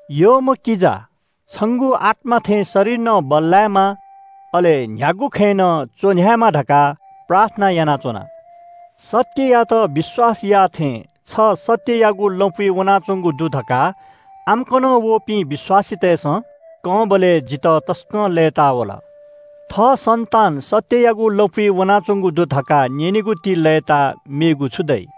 यःम्‍ह किजा, छंगु आत्‍मा थें शरीर नं बल्‍लायेमा, अले न्‍ह्यागु खँय् नं च्‍वन्‍ह्यायेमा धकाः प्रार्थना यानाच्‍वना। सत्‍ययात विश्‍वास याःथें छ सत्‍ययागु लँपुइ वनाच्‍वंगु दु धकाः आम्‍कनं वःपिं विश्‍वासीतय्‌सं कंबलय् जितः तसकं लय्‌ता वल। थः सन्‍तान सत्‍ययागु लँपुइ वनाच्‍वंगु दु धकाः न्‍यनेगुति लय्‌ताः मेगु छु दइ?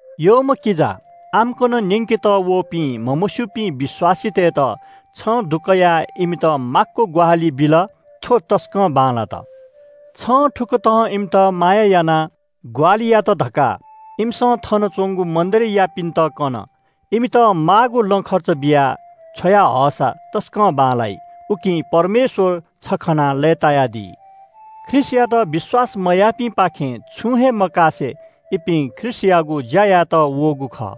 यःम्‍ह किजा, आम्‍कन न्‍यंकेत वःपिं म्‍हमस्‍यूपिं विश्‍वासीतय्‌त छं दुकयाः इमित माक्‍व ग्‍वाहालि बिल, थ्‍व तसकं बांलात। छं थुकथं इमित माया यानाः ग्‍वाहालि यात धकाः इमिसं थन च्‍वंगु मण्‍डलीयापिन्‍त कन। इमित माःगु लँ खर्च बियाः छ्वया हःसा तसकं बांलाइ, उकिं परमेश्‍वर छ खनाः लय्‌तायादी। ख्रीष्‍टयात विश्‍वास मयाःपिंपाखें छुं हे मकासे इपिं ख्रीष्‍टयागु ज्‍या यायेत वःगु खः।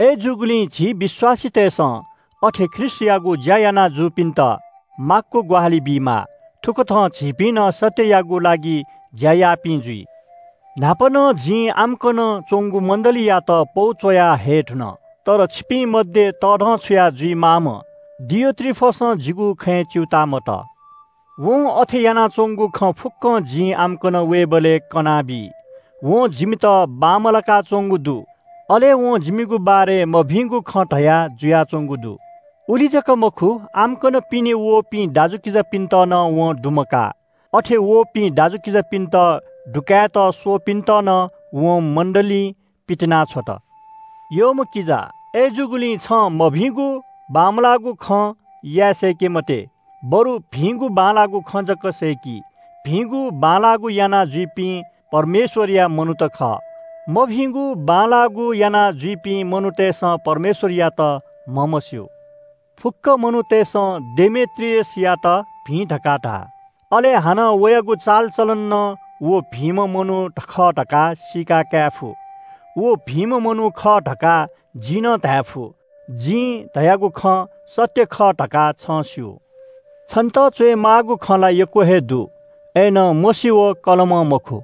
अय्‌जूगुलिं झी विश्‍वासीतय्‌सं अथे ख्रीष्‍टयागु ज्‍या याना जूपिन्‍त माक्‍व ग्‍वाहालि बीमाः। थुकथं झीपिं नं सत्‍ययागु लागि ज्‍या याःपिं जुइ। न्‍हापा नं जिं आम्‍कन च्‍वंगु मण्‍डलीयात पौ च्‍वया हये धुन। तर छिपिं मध्‍ये तःधंछुया जुइमाःम्‍ह डियोत्रिफसं जिगु खँय् च्‍यूताः मतः। वं अथे यानाच्‍वंगु खँ फुक्‍कं जिं आम्‍कन वयेबलय् कनाबी। वं जिमित बांमलाका च्‍वंगु दु। अले वं जिमिगु बारे मभिंगु खँ धया जुयाच्‍वंगु दु। उलि जक मखु, आम्‍कन वःपिं दाजुकिजापिन्‍त नं वं दुमकाः। अथे वःपिं दाजुकिजापिन्‍त दुकायेत स्‍वःपिन्‍त नं वं मण्‍डलीं पितिनाछ्वत। यःम्‍ह किजा, अय्‌जूगुलिं छं मभिंगु बांमलाःगु खँ याये सय्‌के मते, बरु भिंगु बांलाःगु खँ जक सय्‌कि। भिंगु बांलाःगु यानाजुइपिं परमेश्‍वरया मनूत खः। मभिंगु बांमलाःगु यानाजुइपिं मनूतय्‌सं परमेश्‍वरयात म्‍हमस्‍यू। फुक्‍क मनूतय्‌सं डेमेत्रियसयात भिं धकाः धाः। अले हानं वयागु चालचलनं नं व भिंम्‍ह मनू खः धकाः सीका धायेफु। व भिंम्‍ह मनू खः धकाः जिं नं धायेफु। जिं धयागु खँ सत्‍य खः धकाः छं स्‍यू। छन्‍त च्‍वयेमाःगु खँ ला यक्‍व हे दु, अय्‌नं मसी व कलमं मखु।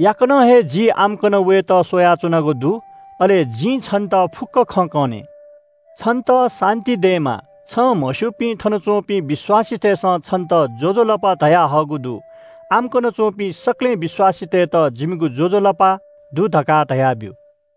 याकनं हे जि आम्‍कन वयेत स्‍वयाच्‍वनागु दु। अले जिं छन्‍त फुक्‍क खँ कने। छन्‍त शान्‍ति दयेमा। छं म्‍हस्‍यूपिं थनच्‍वंपिं विश्‍वासीतय्‌सं छन्‍त ज्‍वजलपा धयाहःगु दु। आम्‍कन च्‍वंपिं सकलें विश्‍वासीतय्‌त जिमिगु ज्‍वजलपा दु धकाः धयाब्‍यु।